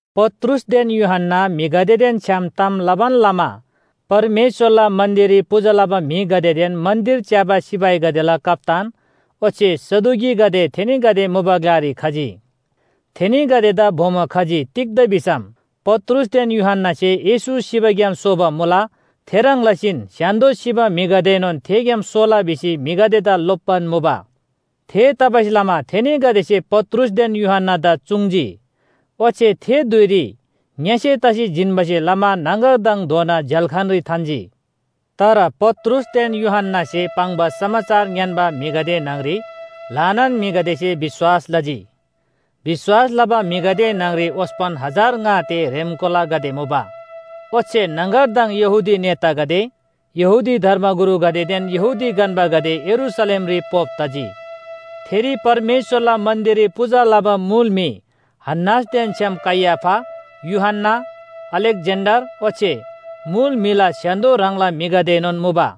पत्रुसदेन यूहन्‍ना म्‍हिगदेदेन छ्‌याम ताम लबान लमा परमेश्‍वरला मन्‍दिररी पूजा लबा म्‍हिगदेदेन मन्‍दिर च्‍याबा सिपाहीगदेला कप्‍तान ओच्‍छे सदुकीगदे थेनीगदे मुबा ग्‍लारी खजी। थेनीगदेदा बोमो खजी, तिग्‍दा भिसम पत्रुसदेन यूहन्‍नासे येशू सिबाग्‍याम सोबा मुला, थेह्रङ् लसीन स्‍य्‍हान्‍दो सिबा म्‍हिगदेएनोन थेग्‍याम सोला भिसी म्‍हिगदेदा लोप्‍बान मुबा। थेतबासेलमा थेनीगदेसे पत्रुसदेन यूहन्‍नादा चुङ्‌जी, ओच्‍छे थे धुइरी ङ्‍यसे तसी जिन्‍बासे लमा न्‍हङगरदङधोना झ्‍याल्‍खानरी थान्‍जी। तर पत्रुसदेन यूहन्‍नासे पाङ्बा समाचार ङ्‌यान्‍बा म्‍हिगदे न्‍हङरी ल्‍हानान म्‍हिगदेसे विश्‍वास लजी। विश्‍वास लबा म्‍हिगदे न्‍हङरी ओस्‍पन हजार ङा ते ह्रेम्‍कोलागदे मुबा। ओच्‍छे न्‍हङगरदङ यहूदी नेतागदे, यहूदी धर्मगुरुगदेदेन यहूदी गन्‍बागदे यरूशलेमरी पोप तजी। थेरी परमेश्‍वरला मन्‍दिररी पूजा लबा मुल म्‍हि हन्‍नासदेन छ्‌याम कैयाफा, यूहन्‍ना, अलेक्‍जेन्‍डर ओच्‍छे मुल म्‍हिला स्‍य्‍हान्‍दो ह्राङला म्‍हिगदेएनोन मुबा।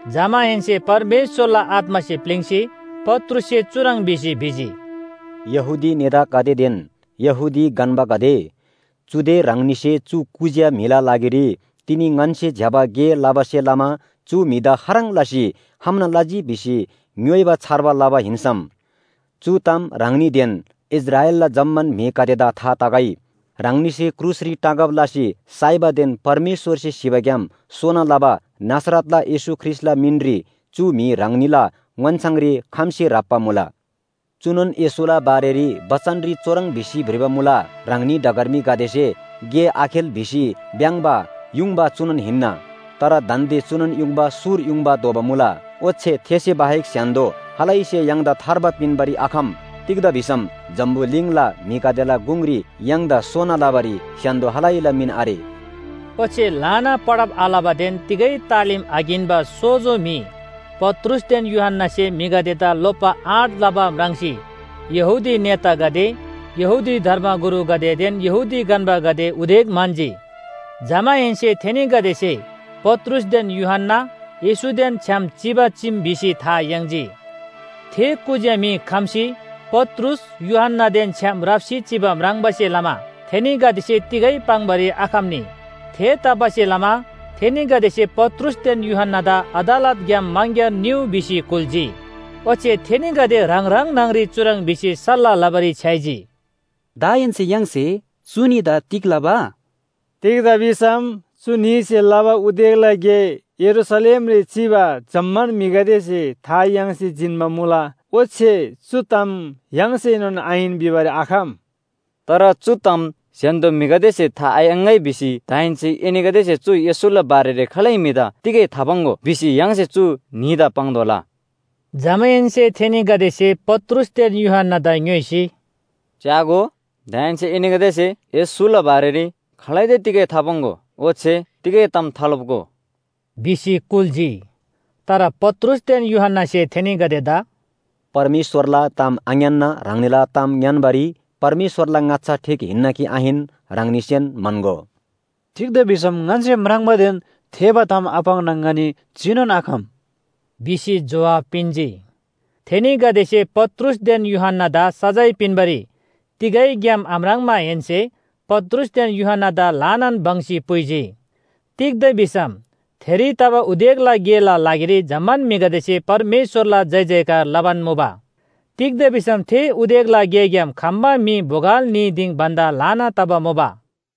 जमाहेन्‍से परमेश्‍वरला आत्‍मासे प्‍लिङ्‌सी पत्रुससे चुह्रङ् भिसी भिजी, “यहूदी नेतागदेदेन यहूदी गन्‍बागदे, चुदे ह्राङनीसे चु कुज्‍या म्‍हिला लागिरी तिनी ङन्‍से ज्‍यबा गे लबासे लमा चु म्‍हिदा खाह्रङ् लसी खम्‍ना लजी भिसी ङ्‌योइबा छार्बा लबा हिन्‍सम, चु ताम ह्राङनीदेन इस्राएलला जम्‍मान म्‍हिगदेदा था तगै, ह्राङनीसे क्रुसरी टाँगब लसी साइबादेन परमेश्‍वरसे सिबाग्‍याम सोना लबा नासरतला येशू ख्रीष्‍टला मिनरी चु म्‍हि ह्राङनीला ओन्‍छाङरी खम्‍सी राप्‍बा मुला। चुनोन येशूला बारेरी बचनरी चुह्रङ् भिसी भ्रिबा मुला, ‘ह्राङनी डकर्मीगदेसे गे आखेल भिसी भ्‍याङ्‍बा युङबा चुनोन हिन्‍ना, तर दान्‍दे चुनोन युङबा सुर युङबा दोबा मुला।’ ओच्‍छे थेसे बाहेक स्‍य्‍हान्‍दो खालैसे य्‍हाङदा थार्बा पिन्‍बारी आखम, तिग्‍दा भिसम जम्‍बुलिङला म्‍हिगदेला गुङरी य्‍हाङदा सोना लबारी स्‍य्‍हान्‍दो खालैला मिन आरे।” ओच्‍छे ल्‍हाना पढब आलबादेन तिगै तालिम आकिन्‍बा सोजो म्‍हि पत्रुसदेन यूहन्‍नासे म्‍हिगदेदा लोप्‍बा आँट लबा म्राङ्सी यहूदी नेतागदे, यहूदी धर्मगुरुगदेदेन यहूदी गन्‍बागदे उदेक म्‍हन्‍जी। जमाहेन्‍से थेनीगदेसे पत्रुसदेन यूहन्‍ना येशूदेन छ्‌याम चिबा चीम भिसी था याङ्जी। थे कुज्‍या म्‍हि खम्‍सी पत्रुस, यूहन्‍नादेन छ्‌याम राप्‍सी चिबा म्राङ्बासे लमा थेनीगदेसे तिगै पाङ्‌बारी आखम्‍नी। थेतबासेलमा थेनीगदेसे पत्रुसदेन यूहन्‍नादा अदालतग्‍याम मङग्‍यार निउ भिसी कुल्‍जी। ओच्‍छे थेनीगदे ह्राङ ह्राङ न्‍हङरी चुह्रङ् भिसी सल्‍लाह लबारी छ्‌याइजी, “दाहेन्‍से य्‍हाङसे चु न्‍हीदा तिग लबा? तिग्‍दा भिसम चु न्‍हीसे लबा उदेकला गे यरूशलेमरी चिबा जम्‍मान म्‍हिगदेसे था याङ्सी जिन्‍बा मुला। ओच्‍छे चु ताम य्‍हाङसेनोन आहिन भिबारी आखम। तर चु ताम स्‍य्‍हान्‍दो म्‍हिगदेसे थाआयाङ्‌गै भिसी ‘दाहेन्‍से एनीगदेसे चु येशूला बारेरी खालै म्‍हिदा तिगै थापाङ्‍गो’ भिसी य्‍हाङसे चु न्‍हीदा पाङ्तोःला।” जमाहेन्‍से थेनीगदेसे पत्रुसदेन यूहन्‍नादा ङ्‌योइसी, “च्‍यागो, दाहेन्‍से एनीगदेसे येशूला बारेरी खालैदा तिगै थापाङ्‍गो ओच्‍छे तिगै ताम थालोप्‍गो” भिसी कुल्‍जी। तर पत्रुसदेन यूहन्‍नासे थेनीगदेदा “परमेश्‍वरला ताम आङ्‌यान्‍ना ह्राङनीला ताम ङ्‌यान्‍बारी परमेश्‍वरला ङाच्‍छा ठीक हिन्‍ना कि आहिन ह्राङनीसेन म्‍हन्‍गो। तिग्‍दा भिसम ङन्‍से म्राङ्बादेन थेःबा ताम आपाङ्ना ङनी चिनोन आखम” भिसी जोहाब पिन्‍जी। थेनीगदेसे पत्रुसदेन यूहन्‍नादा सजाय पिन्‍बारी तिगै ग्‍याम आम्राङ्‌माहेन्‍से पत्रुसदेन यूहन्‍नादा ल्‍हानान बङ्‌सी पुइजी। तिग्‍दा भिसम थेरी तबा उदेकला गेला लागिरी जम्‍मान म्‍हिगदेसे परमेश्‍वरला जयजयकार लबान मुबा। तिग्‍दा भिसम थे उदेकला गेग्‍याम खम्‍बा म्‍हि बोगल न्‍ही दिङ भन्‍दा ल्‍हाना तबा मुबा।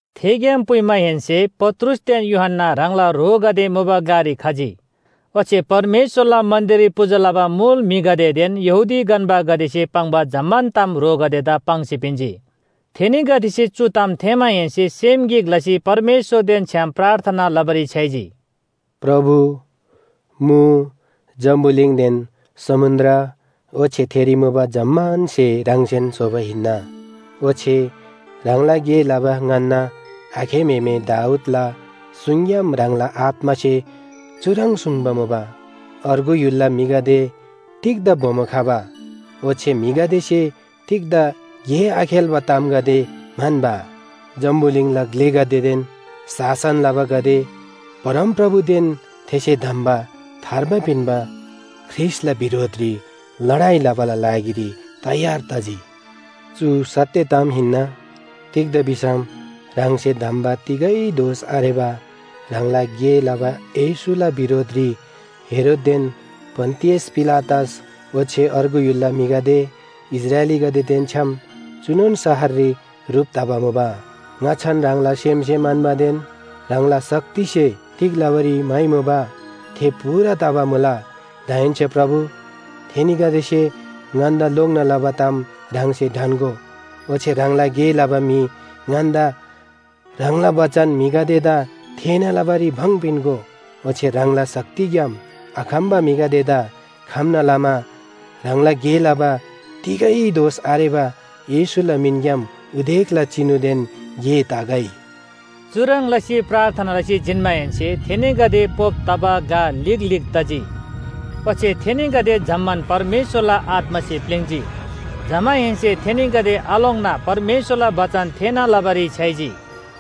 थेग्‍याम पुइमाहेन्‍से पत्रुसदेन यूहन्‍ना ह्राङला ह्रोगदे मुबा ग्‍लारी खजी। ओच्‍छे परमेश्‍वरला मन्‍दिररी पूजा लबा मुल म्‍हिगदेदेन यहूदी गन्‍बागदेसे पाङ्बा जम्‍मान ताम ह्रोगदेदा पाङ्सी पिन्‍जी। थेनीगदेसे चु ताम थेःमाहेन्‍से सेम गिक लसी परमेश्‍वरदेन छ्‌याम प्रार्थना लबारी छ्‌याइजी, “प्रभु, मु जम्‍बुलिङदेन समुन्‍द्र ओच्‍छे थेरी मुबा जम्‍मान स्‍हे ह्राङसेन स्‍होबा हिन्‍ना। ओच्‍छे ह्राङला गे लबा ङन्‍ना आखे म्‍हेमे दाऊदला सुङग्‍याम ह्राङला आत्‍मासे चुह्रङ् सुङ्बा मुबा, ‘अर्गु य्‍हुलला म्‍हिगदे तिग्‍दा बोमो खबा, ओच्‍छे म्‍हिगदेसे तिग्‍दा गे आखेल्‍बा तामगदे म्‍हन्‍बा? जम्‍बुलिङला ग्‍लेगदेदेन शासन लबागदे परमप्रभुदेन थेसे धम्‍बा थार्बा पिन्‍बा ख्रीष्‍टला बिरोधरी लडाइ लबाला लागिरी तयार तजी।’ “चु सत्‍य ताम हिन्‍ना, तिग्‍दा भिसम ह्राङसे धम्‍बा तिगै दोष आरेबा ह्राङला गे लबा येशूला बिरोधरी हेरोददेन पन्‍तियस पिलातस ओच्‍छे अर्गु य्‍हुलला म्‍हिगदे, इस्राएलीगदेदेन छ्‌याम चुनोन शहररी ह्रुप तबा मुबा। ङाच्‍छान ह्राङला सेमसे म्‍हन्‍बादेन ह्राङला शक्तिसे तिग लबारी म्‍हाइमुबा थे पूरा तबा मुला। दाहेन्‍से प्रभु, थेनीगदेसे ङन्‍दा लोङ्‌ना लबा ताम ह्राङसे ढन्‍गो, ओच्‍छे ह्राङला गे लबा म्‍हि ङन्‍दा ह्राङला बचन म्‍हिगदेदा थेःना लबारी भङ पिन्‍गो। ओच्‍छे ह्राङला शक्तिग्‍याम आखम्‍बा म्‍हिगदेदा खम्‍ना लमा ह्राङला गे लबा तिगै दोष आरेबा येशूला मिनग्‍याम उदेकला चिनुदेन गे तगै।” चुह्रङ् लसी प्रार्थना लसी जिन्‍माहेन्‍से थेनीगदे पोप तबा ग्‍ला लिगलिग तजी, ओच्‍छे थेनीगदे जम्‍मान परमेश्‍वरला आत्‍मासे प्‍लिङ्‌जी। जमाहेन्‍से थेनीगदे आलोङ्ना परमेश्‍वरला बचन थेःना लबारी छ्‌याइजी।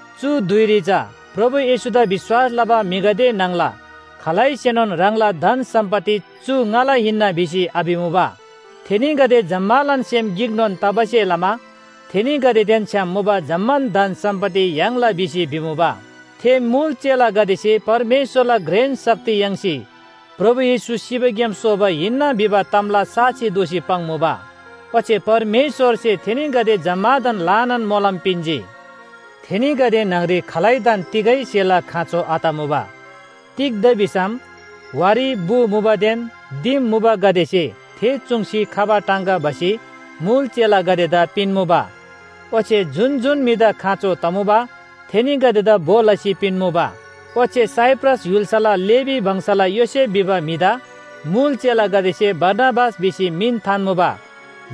चु धुइरी चा प्रभु येशूदा विश्‍वास लबा म्‍हिगदे न्‍हङला खालैसेनोन ह्राङला धन सम्‍पत्ति चु ङाला हिन्‍ना भिसी आभिमुबा। थेनीगदे जम्‍मालान सेम गिकनोन तबासे लमा थेनीगदेदेन छ्‌याम मुबा जम्‍मान धन सम्‍पत्ति य्‍हाङला भिसी भिमुबा। थे मुल चेलागदेसे परमेश्‍वरला घ्रेन शक्ति याङ्सी प्रभु येशू सिबाग्‍याम सोबा हिन्‍ना भिबा तामला साक्षी दोसी पाङ्मुबा, ओच्‍छे परमेश्‍वरसे थेनीगदे जम्‍मादान ल्‍हानान मोलम पिन्‍जी। थेनीगदेला न्‍हङरी खालैदान तिगै स्‍हेला खाँचो आतमुबा, तिग्‍दा भिसम वारी बु मुबादेन दिम मुबागदेसे थे चूङ्सी खबा टाङगा भसी, मुल चेलागदेदा पिन्‍मुबा। ओच्‍छे जुन जुन म्‍हिदा खाँचो तमुबा थेनीगदेदा भो लसी पिन्‍मुबा। ओच्‍छे साइप्रस य्‍हुल्‍साला लेवी वंशला योसेफ भिबा म्‍हिदा मुल चेलागदेसे बारनाबास भिसी मिन थान्‍मुबा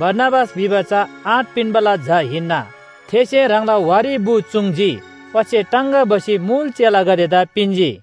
(बारनाबास भिबा चा आँट पिन्‍बाला झा हिन्‍ना), थेसे ह्राङला वारी बु चूङ्‌जी, ओच्‍छे टाङगा भसी मुल चेलागदेदा पिन्‍जी।